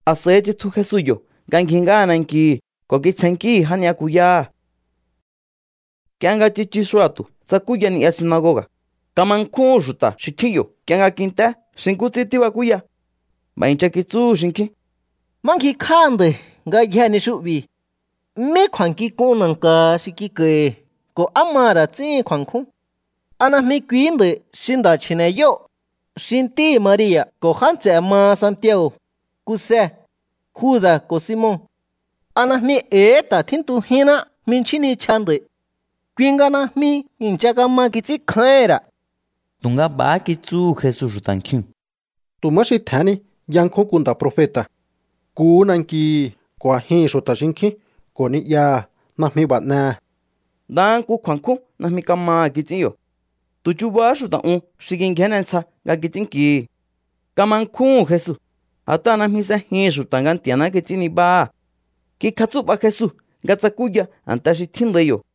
A̱s'a̱i tsitju Jesu yo̱ nga ngji ngáha nankihi̱ ko̱ kitsjennkíhi̱ já ni'yakuyáha̱. Nk'ie nga tsichu xua̱tu̱ tsakúya ni'ya sinagoga̱. Kama nkjúhu̱n xu̱ta̱ xi tjín yo̱ nk'ie nga kint'é xi nkú ts'ín tíbakúya. B'a̱ i̱ncha kitsúhu̱ xinkjín: —¿Má ngjikj'áha nda̱i̱ ngayjee̱ ni xu'bi̱? ¿Mí kju̱a̱nkjink'un na̱nka̱ha xi kik'a̱i̱hi̱ ko̱ á maha̱ ra̱ ts'íhin kju̱a̱nkjún? ¿A najmi kuihí nda̱i̱ xi nda̱ chji̱ne̱yóo̱, xi ntíhi̱ Maria̱ ko̱ já nts'e̱ maha Santiago̱, Kuse, Juda̱ ko̱ Simon? ¿A najmi e̱i̱hí ta̱ tjíntujínná jminchjín nichja nda̱i̱? Kui nga najmi i̱ncha kama kits'ínkjáíhi̱n ra̱. Tu̱nga b'a̱há kitsúhu̱ Jesu xu̱ta̱ nkjiu̱n: —Tu̱ má xi tje̱hén ni yankjún nku nda̱ profeta̱. Nkuhú nankihi̱ ko̱ a̱jihi̱n xu̱ta̱ xinkjín ko̱ ni'yaha̱ najmi b'a̱ n'ehe̱. Ndaha nku kju̱a̱nkjún najmi kamaha̱ kits'ín yo̱. Tu̱ chubahá xu̱ta̱ un xi kingjénne ntsja nga kits'ínnkihi̱. Kama nkjúhu̱n Jesu, a̱t'aha̱ najmi s'ejihi̱n xu̱ta̱ nga Nti̱a̱ná kits'ín nibáha̱. Kikjatsú'ba Jesu nga tsakúya a̱nte xi tjíndai yo̱.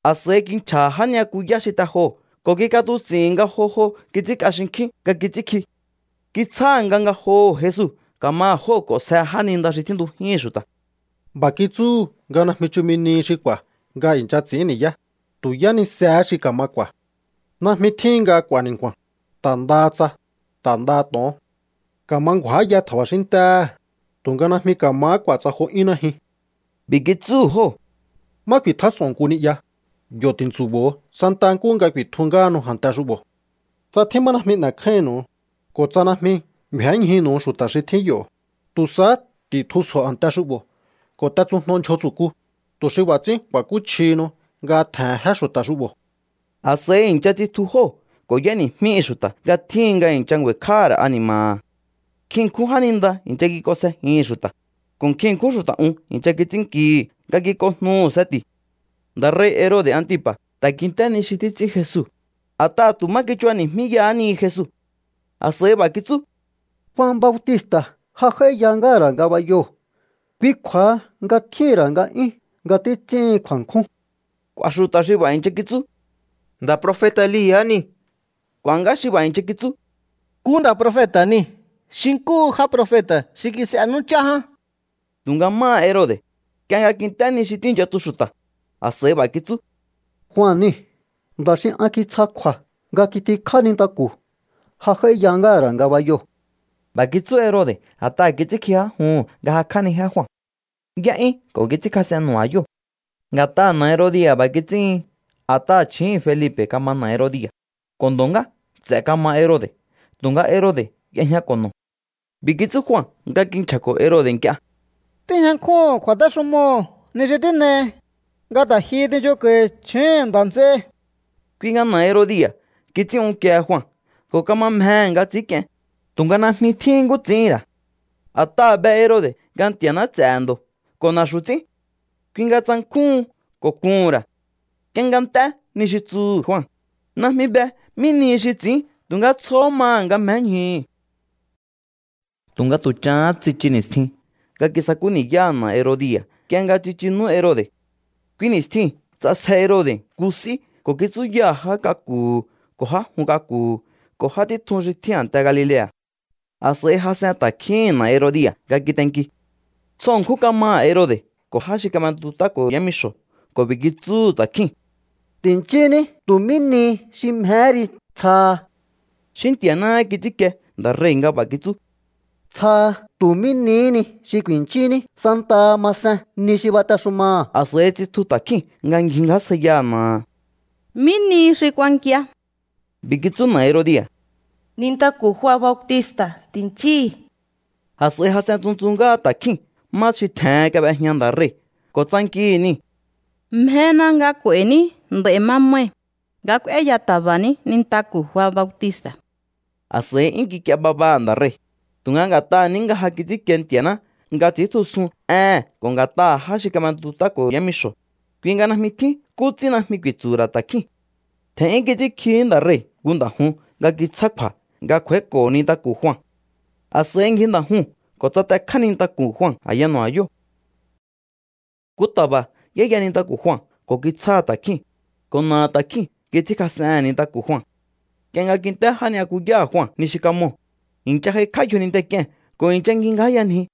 A̱s'a̱i kinchja̱ha̱ já ni'yakuyá xi te joo̱ ko̱ kik'atuts'i̱hi̱n nga jo jo kits'ínk'a xinkjín nga kits'ínkji. Kitsjáha̱ nga ngajoho̱ Jesu ka̱maha̱ jóo̱ k'o̱nsje jáninda xi tjíntujíhi̱n xu̱ta̱. B'a̱ kitsúhu̱ nga najmi chumi nihi xi k'u̱a̱ nga i̱ncha ts'i̱ín ni̱yá, tu̱ yánisehé xi ka̱ma k'u̱a̱. Najmi tjíhin nga k'u̱a̱ ni̱nku̱a̱n, ta̱ ndaha tsa, ta̱ ndaha to̱on. Ka̱ma ngju̱áya tja̱ba̱xín ntéhe̱, tu̱nga najmi ka̱mahá k'u̱a̱ tsa jo 'yún najyun. B'i̱ kitsúhu̱ jóo̱: —Má ku̱i̱tjás'o̱on nku ni'ya, yo̱ ti̱ntsu̱bo̱o santa nkúhu nga ku̱i̱tju ngáhanu a̱nte xu'bo̱. Tsa tjín má najmi n'e̱kjáínnu̱u, ko̱ tsa najmi ngju̱énñjunu̱u xu̱ta̱ xi tjín yo̱, tu̱ sahá ti̱tjusjo̱o a̱nte xu'bo̱ ko̱ t'etsujno ndyjo tsu̱ku, tu̱ xi b'a̱ ts'ín ku̱a̱kúchjihinu nga tje̱he̱n jé xu̱ta̱ xu'bo̱. A̱s'a̱i i̱ncha tsitju jóo̱ ko̱ y'éni̱jmíhi̱ xu̱ta̱ nga tjíhin nga i̱ncha ngju̱a̱i̱kj'áha̱ ra̱ ani̱ma̱ha̱. Nkjin ṉkjún jáninda i̱ncha kik'onsjejihi̱n xu̱ta̱, ko̱ nkjin ṉkjún xu̱ta̱ un i̱ncha kits'ínnkihi̱ nga kik'onjnuhu̱ seti̱. Nda̱ rei̱ Herode̱ Antipa̱ ta̱ kint'é ni xi títs'ín Jesu, a̱t'aha̱ tu̱ má kichubani̱jmíyahá ni Jesu. A̱s'a̱i b'a̱ kitsú: —Jua Bautista̱ ja j'áíya ngáha̱ ra̱ ngabayoo̱. Kui kju̱a̱ha nga tjíhi̱n ra̱ nga'yún nga títs'íhin kju̱a̱nkjún. K'u̱a̱ xu̱ta̱ xi b'a̱ i̱ncha kitsú: —Nda̱ profeta̱ Elia̱ niu̱. K'u̱a̱ ngá xi b'a̱ i̱ncha kitsú: —Nku nda̱ profeta̱ niu̱ xi nkúhu já profeta̱ xi kis'e nú chá ján. Tu̱nga máha Herode̱, nk'ie nga kint'é ni xi tíi̱ncha tsu xu̱ta̱, a̱s'a̱i b'a̱ kitsú: —Jua niu̱. Nda̱ xi an kitsja kju̱a̱ nga kitikjá nintaku̱. Ja j'áíya ngáha̱ ra̱ ngabayoo̱. B'a̱ kitsú Herode̱ a̱t'aha̱ kits'ínkji já juhu̱n nga jakj'ánijé Jua. Y'é'yún ko̱ kits'ínkjas'en nu̱ba̱yóo̱. Nga̱t'aha̱ na̱ Herodia̱ b'a̱ kits'íhin a̱t'aha̱ chju̱úhu̱n Felipe̱ kama na̱ Herodia̱, ko̱ ndo̱ ngá nts'e̱ kamaha Herode̱ tu̱nga Herode̱ y'ejñako̱ no̱. B'i̱ kitsú Jua nga kinchja̱ko̱ Herode̱ nk'ie: —Tíjña nkjúhu̱n kju̱a̱téxumoo̱ ni xi tín'ei, nga ta̱ jihi tinchunko̱i̱ chju̱úhu̱n nda̱ nts'ei. Kui nga na̱ Herodia̱ kits'ín unkiehe Jua ko̱ kama mjehe̱ nga ts'i̱ínk'ien, tu̱nga najmi tjíhín nkú ts'i̱íhi̱n ra̱. A̱t'aha̱ be Herode̱ nga Nti̱a̱ná ts'e̱he̱ ndo̱ ko̱ na̱xu̱ ts'ín. Kui nga tsankjúhun ko̱ kuhu̱n ra̱. Nk'ie nga nt'é ni xi tsuhu̱ Jua, najmi be mí nihi xi ts'i̱ín tu̱nga tsjohó maha̱ nga mjéñjuhu̱. Tu̱nga tu̱ chahán tsichu ni̱stjin nga kisakú ni̱yáha̱ na̱ Herodia̱ nk'ie nga tsichu nú Herode̱. Kui ni̱stjiu̱n ts'asje Herode̱ nku s'í ko̱ kitsúyaha̱ já k'aku̱hu̱ ko̱ já jun k'aku̱hu̱ ko̱ já títjun xi tjín a̱nte Galilea̱. A̱s'a̱i jas'en ta̱kjíhi̱n na̱ Herodia̱ nga kitenki. Tsjo ṉkjún kamaha̱ Herode̱ ko̱ já xi kab'entut'áko̱ho̱ yámixo̱ ko̱ b'i̱ kitsúhu̱ ta̱kjíu̱n: —Ti̱nchíní tu̱ mí ni xi mjehé ri. Tsjaha. Xí Nti̱a̱náhá kits'ínkie nda̱ rei̱ nga b'a̱ kitsú: —Tsjaha tu̱ mí nihí ni xi ku̱i̱nchíní santaha masen ni xi batexumaha̱. A̱s'a̱i tsitju ta̱kjíu̱n nga ngjingjásjaiyaha̱ na̱aha̱: —¿Mí nihi xi kuankia? B'i̱ kitsú na̱ Herodia̱: —Nintaku̱ Jua Bautista̱ ti̱nchíhi̱. A̱s'a̱i jas'en tsuntsu ngáha ta̱kjíu̱n má xi tje̱hen kab'ejña nda̱ rei̱ ko̱ tsankihi̱ niu̱: —Mjena nga k'u̱a̱i̱ní nd'a̱i̱ mamai̱ nga k'úéya ta̱ba̱ ní nintaku̱ Jua Bautista̱. A̱s'a̱i 'yún kik'ie babaha̱ nda̱ rei̱, tu̱nga nga̱t'aha̱ ní nga ja kats'ínkie Nti̱a̱ná nga ts'i̱íntjusun éhe̱n ko̱ nga̱t'aha̱ já xi kab'entut'áko̱ho̱ yámixo̱, kui nga najmi tjín nkú ts'ín najmi ku̱i̱tsu̱hu̱ ra̱ ta̱kjíu̱n. Tje̱n'yún kits'ínkjihí nda̱ rei̱ nku nda̱ jun nga kitsjáha̱ kju̱a̱ nga kj'u̱a̱íko̱ nintaku̱ Jua. A̱s'a̱i ngji nda̱ juu̱n ko̱ tsatekjá nintaku̱ Jua a̱ya nu̱ba̱yóo̱. Nku ta̱ba̱ y'éya nintaku̱ Jua ko̱ kitsjáha̱ ta̱kjíu̱n, ko̱ na̱aha̱ ta̱kjíu̱n kits'ínkjas'ehe̱n nintaku̱ Jua. Nk'ie nga kint'é já ni'yakuyáha̱ Jua ni xi kamoo̱, i̱ncha j'aikj'á yjoninte k'ie̱n ko̱ i̱ncha ngjingjáyanji.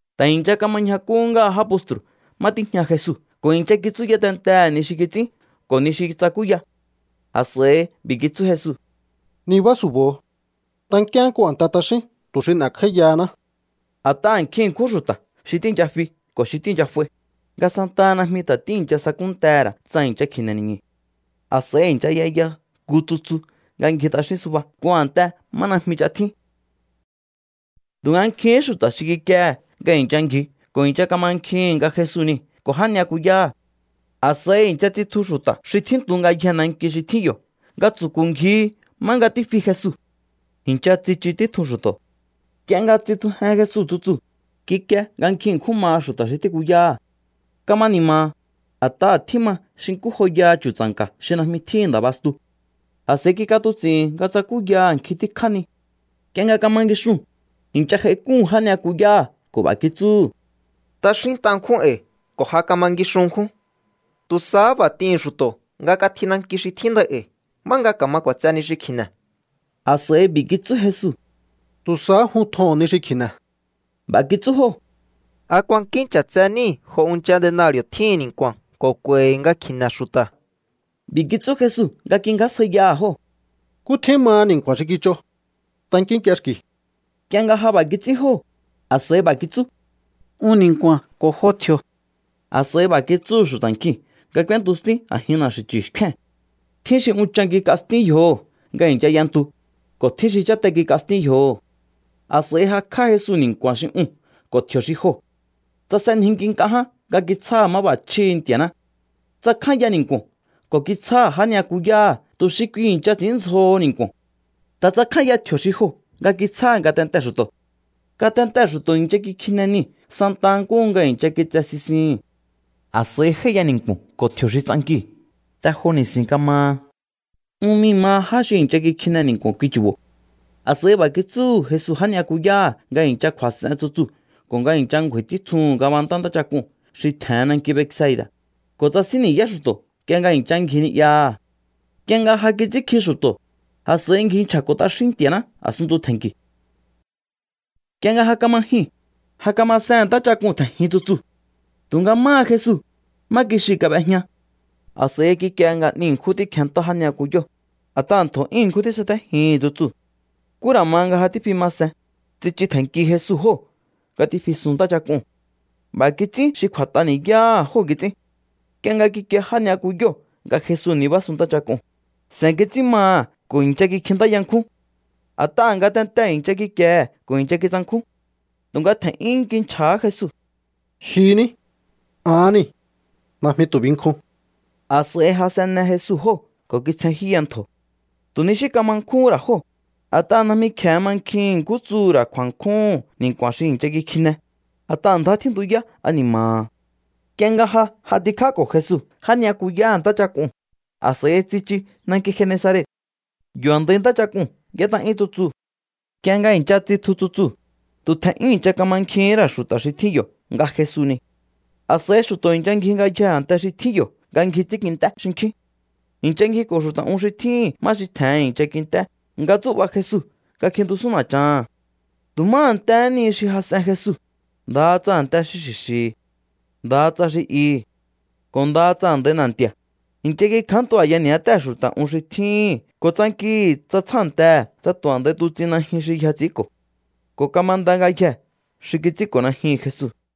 Ta̱ i̱ncha kama ñjakú ngáha já postru̱ má tíjña Jesu ko̱ i̱ncha kitsúya tentehe̱ ni xi kits'ín ko̱ ni xi tsakúya. A̱s'a̱i b'i̱ kitsú Jesu: —Nibá su̱bo̱o. Tankíaán nku a̱nte t'axín tu̱ xi n'e̱kj'áíyahaná. A̱t'aha̱ nkjin ṉkjún xu̱ta̱ xi tíi̱ncha fi ko̱ xi tíi̱ncha f'ai, nga santaha najmi ta̱ tíi̱ncha sakúntehe̱ ra̱ tsa i̱ncha kji̱ne̱ ni̱ñu̱. A̱s'a̱i i̱ncha y'eya nku tsutsu nga ngji t'axín suba nku a̱nte má najmi ch'a tjín. Tu̱nga nkjihín xu̱ta̱ xi kikiehe̱ nga i̱ncha ngji ko̱ i̱ncha kamankjihi̱n nga Jesu niu̱ ko̱ já ni'yakuyáha̱. A̱s'a̱i i̱ncha tsitju xu̱ta̱ xi tjíntu ngayjee̱ nanki xi tjín yo̱ nga tsu̱ku̱ ngjihi má nga tífi Jesu. I̱ncha tsichu títjun xu̱to̱. Nk'ie nga tsitjujen Jesu tsutsuu̱, kikie nga nkjin ṉkjún maha xu̱ta̱ xi tíkuyáha̱. Kama ni̱ma̱ha̱, a̱t'aha̱ tjíma xi nkú joyaha chu̱tsa̱nka̱ xi najmi tjíhi̱n nda̱ bastu. A̱s'a̱i kik'atuts'i̱hi̱n nga tsakúyaha̱ nkjin tíkjá ni. Nk'ie nga kama ngixuu̱n, i̱ncha j'aik'úhu̱n já ni'yakuyáha̱ ko̱ b'a̱ kitsúhu̱: —T'axínt'a ṉkjún e̱i̱ ko̱ ja kama ngixun ṉkjún. Tu̱ sahá b'a̱ t'ihi̱n xu̱to̱ nga katji nanki xi tjíndai e̱i̱ má nga ka̱ma k'u̱a̱tse ni xi kji̱ne̱. A̱s'a̱i b'i̱ kitsú Jesu: —Tu̱ sahá jun tjoho̱on ni xi kji̱ne̱. B'a̱ kitsú jóo̱: —¿A kuankín ch'a̱tse níi̱ jo unchan denari̱o̱ tjíhin ni̱nku̱a̱n ko̱ k'u̱a̱i̱hi̱ nga kji̱ne̱ xu̱ta̱? B'i̱ kitsú Jesu nga kingjásjaiyaha̱ jóo̱: —¿Nkú tjín maha ni̱nku̱a̱n xi kich'o? Tankínk'iexki̱u. Nk'ie nga ja b'a̱ kits'ín jóo̱, a̱s'a̱i b'a̱ kitsú: —Un ni̱nku̱a̱n ko̱ jo tji̱o̱. A̱s'a̱i b'a̱ kitsúhu̱ xu̱ta̱ nkjiu̱n nga k'úéntu stín a̱jin na̱xi̱chu̱ xkjúe̱n. Tjín xi unchan kik'a stín yjoho̱ nga i̱ncha y'entu, ko̱ tjín xi cháte kik'a stín yjoho̱. A̱s'a̱i jakj'á Jesu ni̱nku̱a̱n xi uu̱n ko̱ tji̱o̱ xi joo̱. Tsasenjinki nk'a ján nga kitsjáha̱ máb'a̱chjíhi̱ Nti̱a̱ná. Tsakjánya ni̱nku̱o̱n ko̱ kitsjáha̱ já ni'yakuyáha̱ tu̱ xi kui i̱ncha ts'i̱ínndzjoho ni̱nku̱o̱n. Ta̱ tsakjánya tji̱o̱ xi joo̱ nga kitsjáha̱ ngatentee̱ xu̱to̱. Ngatentee̱ xu̱to̱ i̱ncha kikjine niu̱ santa nkúhu nga i̱ncha kitse sisihi̱n. A̱s'a̱i j'áíya ni̱nku̱o̱n ko̱ tji̱o̱ xi tsankiu̱. Te jo ni̱si̱n kamaha. Un mii̱ maha já xi i̱ncha kikjine ni̱nku̱o̱n kui chu̱bo̱. A̱s'a̱i b'a̱ kitsúhu̱ Jesu já ni'yakuyáha̱ nga i̱ncha kju̱a̱s'en tsutsuu̱ ko̱ nga i̱ncha ngju̱a̱i̱ títjuhu̱n ngabantá ntáchak'uu̱n xi tje̱hen nanki Betsaida̱, ko̱ tsasín ni̱yá xu̱to̱ nk'ie nga i̱ncha ngji ni'yaha̱. Nk'ie nga ja kits'ínkji xu̱to̱, a̱s'a̱i ngji nchja̱ko̱ t'axín Nti̱a̱ná a̱sunntu tje̱nki̱u̱. Nk'ie nga ja kama jyuu̱n, ja kamasehe̱n ntáchak'uu̱n tje̱njin tsutsuu̱. Tu̱nga máha Jesu, má kixiu̱ kab'ejña. A̱s'a̱i kikie nga 'ni ṉkjún tíkjenntá já ni'yakuyóo̱, a̱t'aha̱ ntjo̱ 'yún ṉkjún tísatéjihi̱n tsutsuu̱. Nkú ra̱ ma nga ja tífi ma sen, tsichu tje̱nnki Jesu jóo̱ nga tífisun ntáchak'uu̱n. B'a̱ kits'ín xi kju̱a̱t'a ni̱yáha̱ jóo̱ kits'ín. Nk'ie nga kikie já ni'yakuyóo̱ nga Jesu nibásun ntáchak'uu̱n, se̱n kits'ín maha̱ ko̱ i̱ncha kikjintáya nkjún. A̱t'aha̱ ngatentee̱ i̱ncha kikiehe̱ ko̱ i̱ncha kitsankjún. Tu̱nga tje̱n'yún kinchja̱há Jesu: —¡Jyu ní! ¡Ahán niu̱! ¡Najmi tu̱ binkjun! A̱s'a̱i jas'enne Jesu jóo̱ ko̱ kitsjenjyúya ntjo̱. Tu̱ ni xí kama nkjúhún ra̱ jóo̱, a̱t'aha̱ najmi kje̱e mankjihi̱n nkú tsuhu̱ ra̱ kju̱a̱nkjúhu̱n ni̱nku̱a̱n xi i̱ncha kikjine, a̱t'aha̱ ndjá tjíntuyá ani̱ma̱ha̱. Nk'ie nga ja j'atikjáko̱ Jesu já ni'yakuyáha̱ ntáchak'uu̱n, a̱s'a̱i tsichu nanki Genesaret. Yo̱ a̱ndai ntáchak'uu̱n y'ét'a'yún tsutsuu̱. Nk'ie nga i̱ncha tsitju tsutsuu̱, tu̱ tje̱n'yún i̱ncha kamankjihín ra̱ xu̱ta̱ xi tjín yo̱ nga Jesu niu̱. A̱s'a̱i xu̱to̱ i̱ncha ngji ngayjee̱ a̱nte xi tjín yo̱ nga ngji ts'ínkint'é xinkjín. I̱ncha ngjiko̱ xu̱ta̱ un xi tjíhi̱n má xi tje̱hen i̱ncha kint'é nga tsú'ba̱ Jesu nga kjintusún na̱chaha̱n. Tu̱ má a̱ntehé ni xi jas'en Jesu, ndaha tsa a̱nte xi xi̱xi̱, ndaha tsa xi ihi̱, ko̱ ndaha tsa a̱ndai na̱nti̱a̱, i̱ncha kikjántu a̱ya ni̱yátée̱ xu̱ta̱ un xi tjíhi̱n ko̱ tsankihi̱ tsa tsjántehe̱ tsa tu̱ a̱ndai tuts'in najyun xi yja ts'i̱ínko̱. Ko̱ kamanda ngayjee̱ xi kits'ínko̱ najyuhu̱n Jesu.